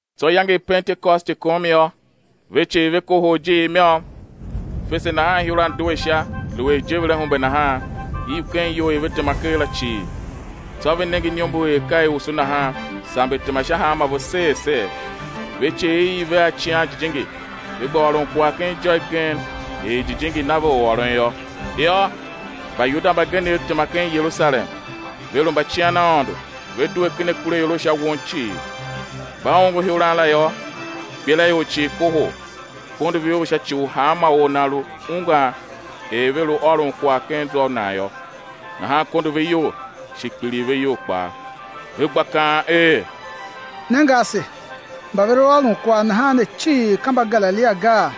Tsô iyange i Pentekosti kom yô, ve cii ve kohol ijiir i môm. Fese nahan ihuran due sha, lu er ijeverahumbe nahan, iv ken iyou i ve tema ker la cii. Tsô ve nenge iniombor er ka i usu nahan, samber tema sha hanmô ve ser ser. Ve cii i iv ve a Icighan Jijingi, ve gba ôron kwagh ken ijô igen er Jijingi na ve u ôron yô. Yô, Mbayuda mbagenev tema ken Yerusalem, ve lu mbacian Aôndo, ve due ken akuraior a sha won cii. Mba ongo ihuran la yô, ikpelaior cii kohol, kondo ve iyol sha ci u hanma or nan lu ungwan er ve lu ôron kwagh ken zwa u nan yô. Nahan kondo ve iyol, shi kpiligh ve iyol kpaa, ve gba kaan er: Nenge ase, mba ve lu ôron kwagh nahan ne cii ka Mbagalilia gaa?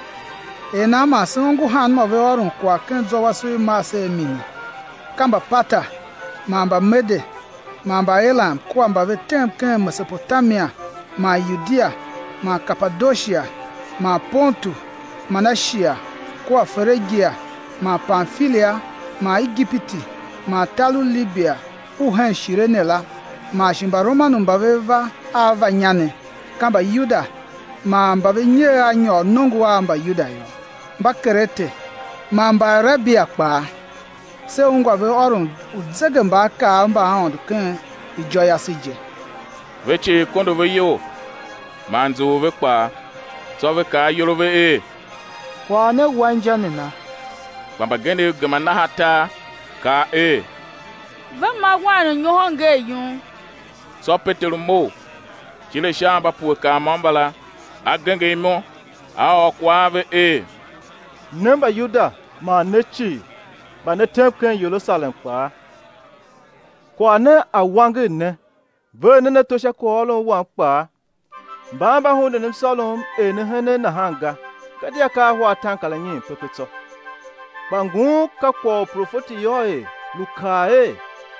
Er nan man se ongo hanmô ve ôron kwagh ken zwa wase u i mar se a mini? Ka Mbaparta man Mbamede man Mbaelam kua mba ve tem ken Mesopotamia man Yudia man Kapadoshia man Pontu man Ashia, kua Ferigia man Pamfilia man Igipiti man tar u Libia u hen Shirene la, man shi Mbaromanu mba ve va a va inya ne, ka Mbayuda man mba ve nyer a nyôr nongo u Mbayuda yô, Mbakerete man Mbaarabia kpaa, se ungwa ve ôron uzegembaakaav mba Aôndo ken ijô yase je. Ve cii kondo ve iyol man nzughul ve kpaa, tsô ve kaa ayol a ve er: Kwagh ne wa inja nana? Kpa mbagenev gema naha tar, kaa er: Ve ma wain u nyohon ngee yum. Tsô Peteru mough, tile sha a mba pue kar môm mbala, a genger imo, a ôr kwagh a ve er: Ne Mbayuda, man ne cii, mba ne tem ken Yerusalem kpaa, kwagh ne a̱ wanger ne, ver nen ato sha kwaghôron wam kpaa. Mban mba hunden msôrom er ne henen nahan ga, gadia ka ahwa ataankaranyiin pepe tsô. Kpa ngun ka kwagh u profeti Yoel lu kaa er: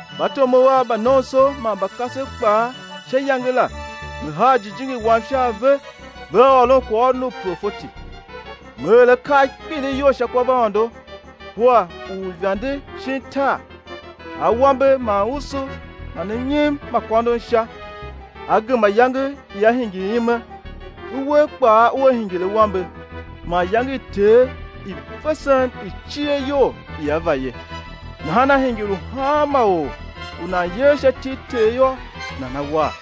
Mbatomov Av mba nomso man mba kasev kpaa, sha iyange la, Me haa Jijingi Wam sha a ve, vea ôron kwaghôron u profeti. Me er akaa a kpilighyol sha kwavaôndo kua uivande shin tar; awambe man usu man mnyim ma a kôndon Sha. Á gema iyange ia hingir ime, uwer kpaa ua hingir awambe, man iyange i Ter i vesen i cier iyol ia va ye. Nahan á hingir u hanma or u nan yer sha iti i Ter yô, nana war.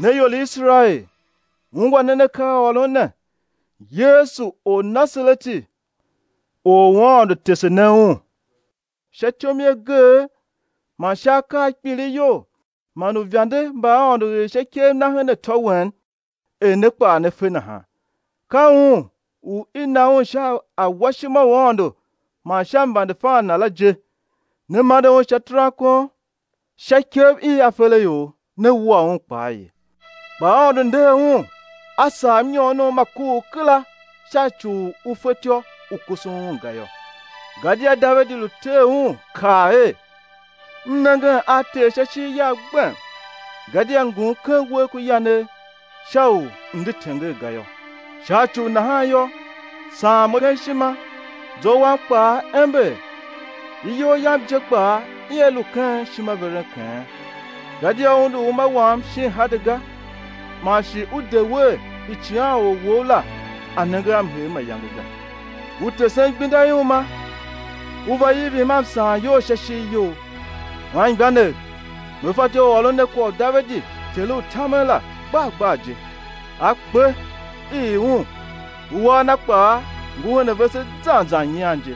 Ne ior i Iserael, ungwa nen akaaôron ne: Yesu, Ornasareti Or u Aôndo tese ne Un sha ityom i ageegh man sha akaa a kpilighyol man uivande mba Aôndo er sha ikev Na her atô wen, er ne kpaa ne fe nahan; ka Un u i na Un sha awashima u Aôndo man sha mvandefan Na la je, ne mande Un sha terankon sha ikev i aferaior, ne wua Un kpaa ye, kpa Aôndo nder Un, A sagh mnyoonom ma kuugh kera sha ci u u fetyô u kusun Un ga yô. Gadia Davidi lu ter Un, kaa er: M nengen a Ter sha ishigh yagh gbem; gadia ngum ken uwegh ku yanegh sha u m̱ de tenger ga yô; sha ci u nahan yô, saan mo ken ishima, zwa wam kpaa ember; iyol yam je kpaa ia lu ken ishimaverenkeghen. Gadia Ú undu uma wam shin Hade ga, man shi U de wer Icighanor Wou la A̱ nenge a mhee mayange ga. Ú tesem igbenda i uma; Ú va ivim a msaanyol sha ishigh You. Anmgbianev, me fatyô u ôron ne kwagh u Davidi, ter u tamen la, gbar gbar je; a kpe, i ii un, uwar na kpaa ngu hen a vese zan zan nyian je.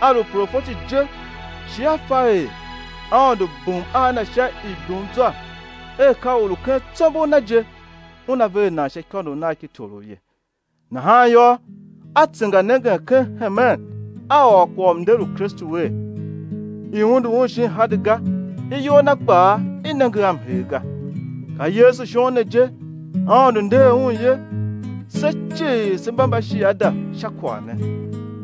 A lu profeti je shi a fa er Aôndo bum a na sha ibumzwa er ka or u ken tsombor na je, Una ver nan sha ikônough nagh ki torough ye, nahan yô, a tsenganengen ken hemen a ôr kwagh u mnder u Kristu er, i undu Un shin Hade ga, iyol Na kpaa i nenge a mhee ga. Ka Yesu shon ne je, Aôndo nder Un ye, se cii se mba shiada sha kwagh ne.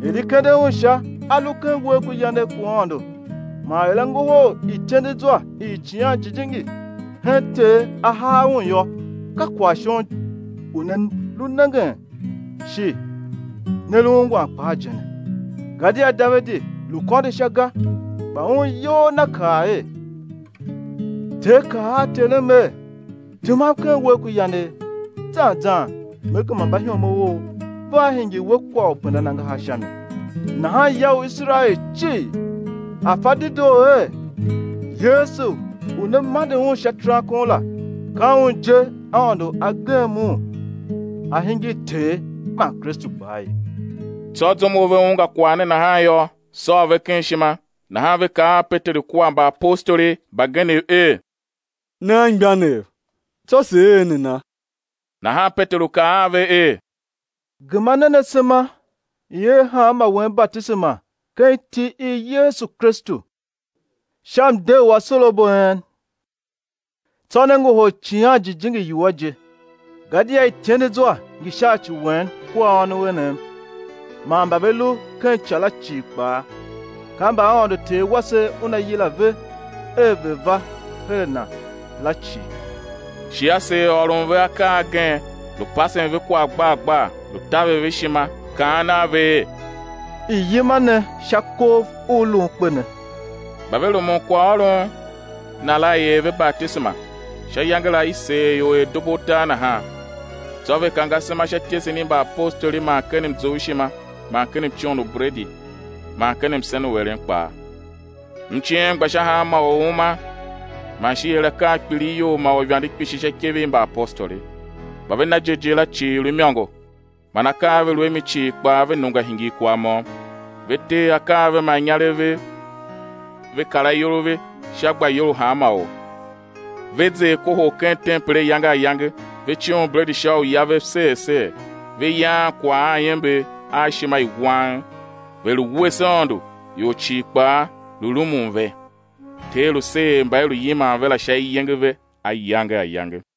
Er i kende Un sha a lu ken uwegh ku yanegh ku Aôndo man er A ngohol ityendezwa i Icighan Jijingi hen Ter A haa Un yô, ka kwagh shon u ne lu nengen shi ne lu ungwan kpaa je ne. Gadia Davidi lu kôndo Sha ga, kpa un iyol na kaa er: Ter kaa a Terem er: Temam ken uwegh ku yanegh, zan zan Me gema mbaihomov Ou, vea hingir We kwagh u pendan angahar sha mi. Nahan ya u Iserael cii a̱ fa dedoo er: Yesu u ne mande Un sha terankon la, ka Un je Aôndo a gem Un A hingir Ter man Kristu kpaa ye. Tsô, zum u ve ungwa kwagh ne nahan yô, sôô ve ken ishima, nahan ve kaa a Peteru kua mbaapostoli mbagenev er: Ne anmgbianev, tsô sé er nana? Nahan Peteru kaa a ve er: Gema nen asema, i̱ er hanmô wen batisema ken iti i Yesu Kristu sha mde u asorabo a en, tsô né ngohol Icighan Jijingi iwua je. Gadia ityendezwa ngi sha ci wen kua ônov enev man mba ve lu ken ica la cii kpaa, ka mba Aôndo Ter wase Una yila ve er ve̱ va her a Na la cii. Shi a seer ôron ve akaa agen, lu pasen ve kwagh gbar gbar, lu taver ve ishima, kaan a ve er: I̱ yima ne sha kov u lun kpe ne. Mba ve rumun kwaghôron na la i er ve batisema; sha iyange la i seer ior er dubu utar nahan. Tsô ve kange asema sha ityesen i mbaapostoli man ken mzoughshima, man ken mcoon u bredi, man ken msen u eren kpaa. Mciem gba sha hanma or u uma, man shi i er akaa a kpilighyol man uivande kpishi sha ikev i mbaapostoli. Mba ve na jighjigh la cii lu imôngo, man akaa a ve lu a mi cii kpaa ve nungwa hingir kwagh môm. Ve tee akaa a ve man inyarev vev, ve kar ayol a ve sha gbayol u hanma or. Ve zer kohol ken tempel ayange ayange, ve coon bredi sha uya vev ser ser, ve yaan kwagh a iember man a ishima i wang, ve lu wuese Aôndo, ior cii kpaa lu rumun ve. Ter lu seer mba i lu yiman ve la sha iyenge ve ayange ayange.